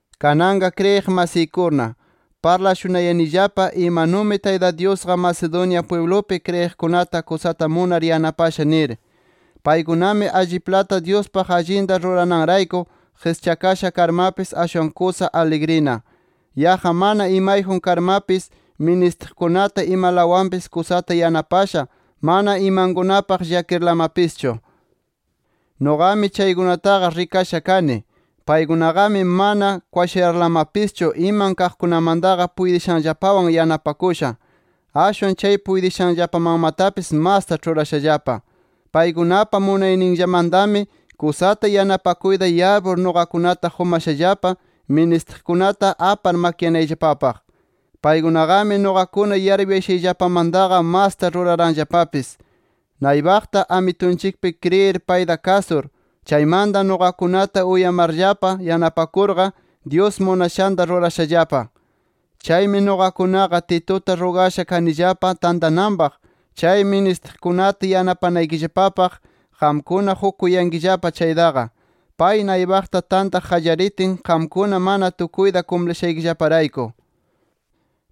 Kananqa kriyiq masiykuna, parlashunayanillapa imanumi Tayta Dyusqa, Macedonia pwiblupi kriyiqkunata kusata munar yanapasha nir. Paykunami alliplata Dyuspaq allinta rurananrayku qischakasha karmapis, ashwan kusa aligrina. Yaqqa mana imayjun karmapis, ministiqkunata imalawanpis kusata yanapasha, mana imankunapaq llakirlamapischu. Nuqami chaykunataqa rikasha kani. Paykunaqami mana kwashayarlamapischu iman kaqmantaqa puytishanllapawan yanapakusha. Ashwan chay puytishanllapamanmatapis masta ĉhurashallapa. Paykunapa munayninllamantami kusata yanapakuyta yarpur nuqakunata qumashallapa, ministiqkunata apar makyanayllapapaq. Paykunaqami nuqakuna yarpuyashayllapamantaqa masta ruraranllapapis. Naypaqta Amitunchikpi kriyir payta kasur, chaymanta nuqakunata uyamarllapa yanapakurqa, Dyus munashanta rurashallapa. Chaymi nuqakunaqa, Tituta rugasha kanillapa tantananpaq chay ministiqkunata yanapanaykillapapaq qamkuna qukuyankillapa chaytaqa, pay naypaqta tantaq qallaritin qamkuna mana tukuyta kumplishaykillaparayku.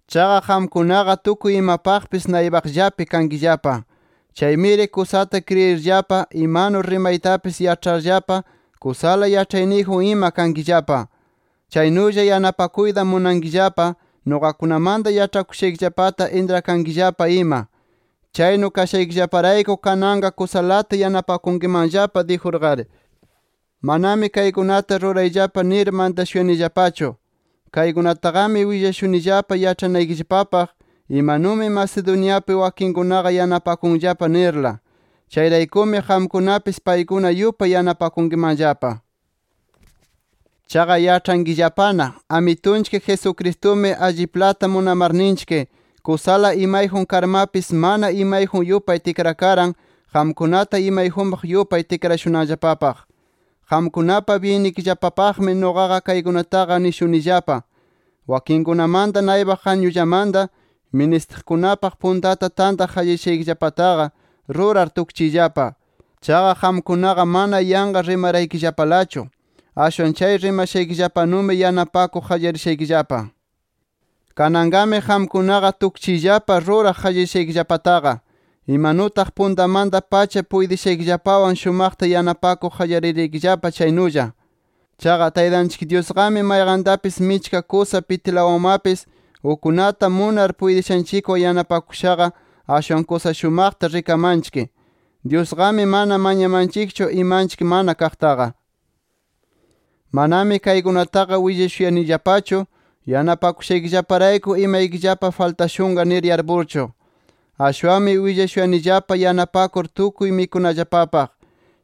Chaqa qamkunaqa tukuy imapaqpis naypaqllapi kankillapa. Chaymiri kusata kriyirllapa, imanu rimaytapis yaĉharllapa, kusala yaĉhayniyjun ima kankillapa. Chaynulla yanapakuyta munankillapa, nuqakunamanta yaĉhakushaykillapata intrakankillapa ima. Chaynu kashaykillaparayku kananqa kusalata yanapakunkimanllapa dijurqari. Manami kaykunata rurayllapa nir mantashuyanillapachu. Kaykunataqami willashunillapa yaĉhanaykillapapaq imanumi Macedoniapi wakinkunaqa yanapakunllapa nirla. Chayraykumi qamkunapis, paykuna yupay yanapakunkimanllapa. Chaqa yaĉhankillapana, Amitunchik Jesucristumi alliplata munamarninchik kusala imayjun karmapis mana imayjun yupay tikrakaran qamkunata imayjunpaq yupay tikrashunanllapapaq. Qamkunapa byinnikillapapaqmi nuqaqa kaykunataqa nishunillapa. Wakinkunamanta naypaq añullamanta, ministiqkunapaq puntata tantaq qallarishaykillapataqa, rurar tukchiyllapa. Chaqa qamkunaqa mana yanqa rimaraykillapalachu. Ashwan chay rimashaykillapanumi yanapakuq qallarishaykillapa. Kananqami qamkunaqa tukchiyllapa ruraq qallarishaykillapataqa, imanutaq puntamanta-pacha puytishaykillapawan shumaqta yanapakuq qallariraykillapa chaynulla. Chaqa, Taytanchik Dyusqami mayqantapis, michka kusa pitilawanmapis ukkunata munar puytishanchikwan yanapakushaqa, ashwan kusa shumaqta rikamanchik. Dyusqami mana mañamanchikchu imanchik mana kaqtaqa. Manami kaykunataqa willashuyanillapachu yanapakushaykillaparayku imaykillapa faltashunqa nir yarpurchu. Ashwanmi willashuyanillapa yanapanakur tukuy mikunallapapaq.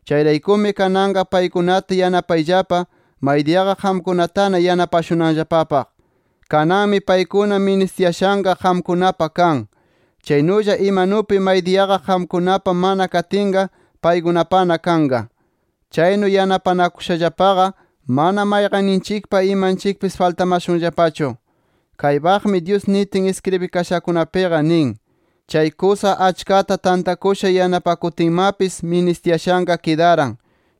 Chayraykumi kananqa paykunata yanapayllapa, maydiyaqa qamkunatana yanapashunanllapapaq. Kananmi paykuna ministiyashanqa, qamkunapa kan. Chaynulla imanupi maydiyaqa qamkunapa mana katinqa, paykunapana kanqa. Chaynu yanapanakushallapaqa mana mayqanninchikpa imanchikpis faltamashunllapachu. Kaypaqmi Dyus nitin iskribikashakunapiqa nin: “Chay kusa achkata tantakusha yanapakutinmapis, ministiyashanqa kidaran.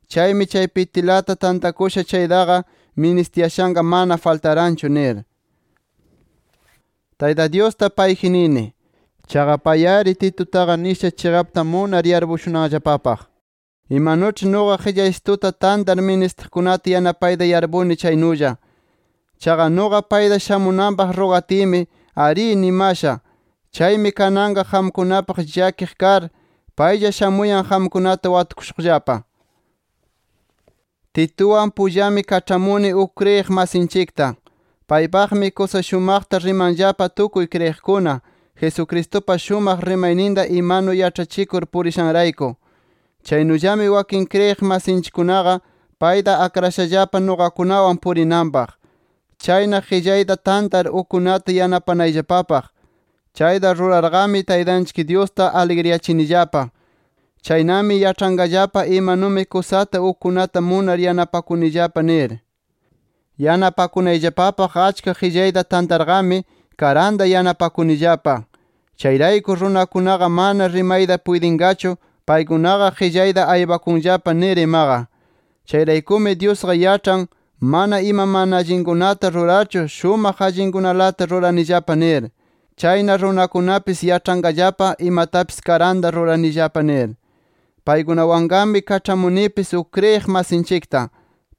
Chaymi chay pitilata tantakusha chaytaqa, ministiyashanqa mana faltaranchu nir”. Tayta Dyusta payji nini. Chaqa pay-ari, Titutaqa nisha chiqapta munar yarpushunanllapapaq, imanuĉhi nuqa qillaysituta tantar ministiqkunata yanapayta yarpuni chaynulla. Chaqa nuqa payta shamunanpaq rugatiymi “Arí” nimasha. Chaymi kananqa qamkunapaq llakiq kar, paylla shamuyan qamkunata watukushuqllapa. Tituwan pullami kaĉhamuni uk kriyiq masinchikta. Paypaqmi, kusa shumaqta rimanllapa tukuy kriyiqkuna, Jesucristupa shumaq rimayninta imanu yaĉhachikur purishanrayku. Chaynullami wakin kriyiq masinchikkunaqa, payta akrashallapa nuqakunawan purinanpaq. Chayna qillayta tantar ukkunata yanapanayllapapaq. Chayta rurarqami, Taytanchik Dyusta aligriyachinillapa. Chaynami yaĉhanqallapa imanumi kusata ukkunata munar, yanapakunillapa nir. Yanapakunayllapapaq achka qillayta tantarqami karanta yanapakunillapa. Chayrayku runakunaqa mana rimayta puytinqachu, paykunaqa qillayta aypakunllapa nir imaqa. Chayraykumi Dyusqa yaĉhan, mana ima mana allinkunata rurarchu, shumaq allinkunalata ruranillapa nir. Chayna runakunapis yaĉhanqallapa, imatapis karanta ruranillapa nir. Paykunawanqami kaĉhamunipis uk kriyiq masinchikta.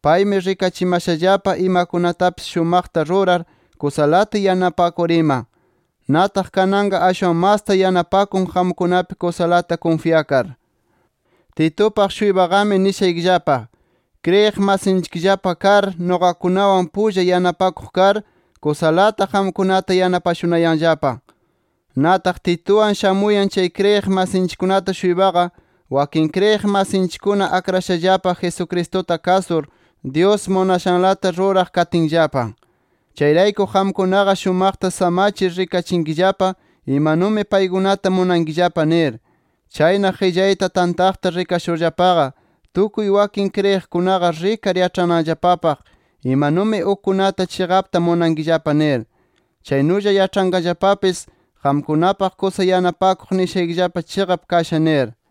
Paymi rikachimashallapa imakunatapis shumaqta rurar, kusalata yanapakur ima. Nataq kananqa ashwan masta yanapakun qamkunapi kusalata kunfyakar. Titupaq-shuypaqami nishaykillapa: Kriyiq masinchikllapa kar, nuqakunawan pulla yanapakuq kar, kusalata qamkunata yanapashunayanllapa. Nataq Tituwan shamuyan chay kriyiq masinchikkunata-shuypaqa, wakin kriyiq masinchikkuna akrashallapa, Jesucristuta kasur, Dyus munashanlata ruraq katinllapa. Chayrayku qamkunaqa, shumaqta samachir rikachinkillapa imanumi paykunata munankillapa nir. Chayna qillayta tantaqta rikashurllapaqa, tukuy wakin kriyiqkunaqa rikar yaĉhananllapapaq, imanumi ukkunata chiqapta munankillapa nir. Chaynulla yaĉhanqallapapis, qamkunapaq kusa yanapakuq nishayqa chiqap kasha nir.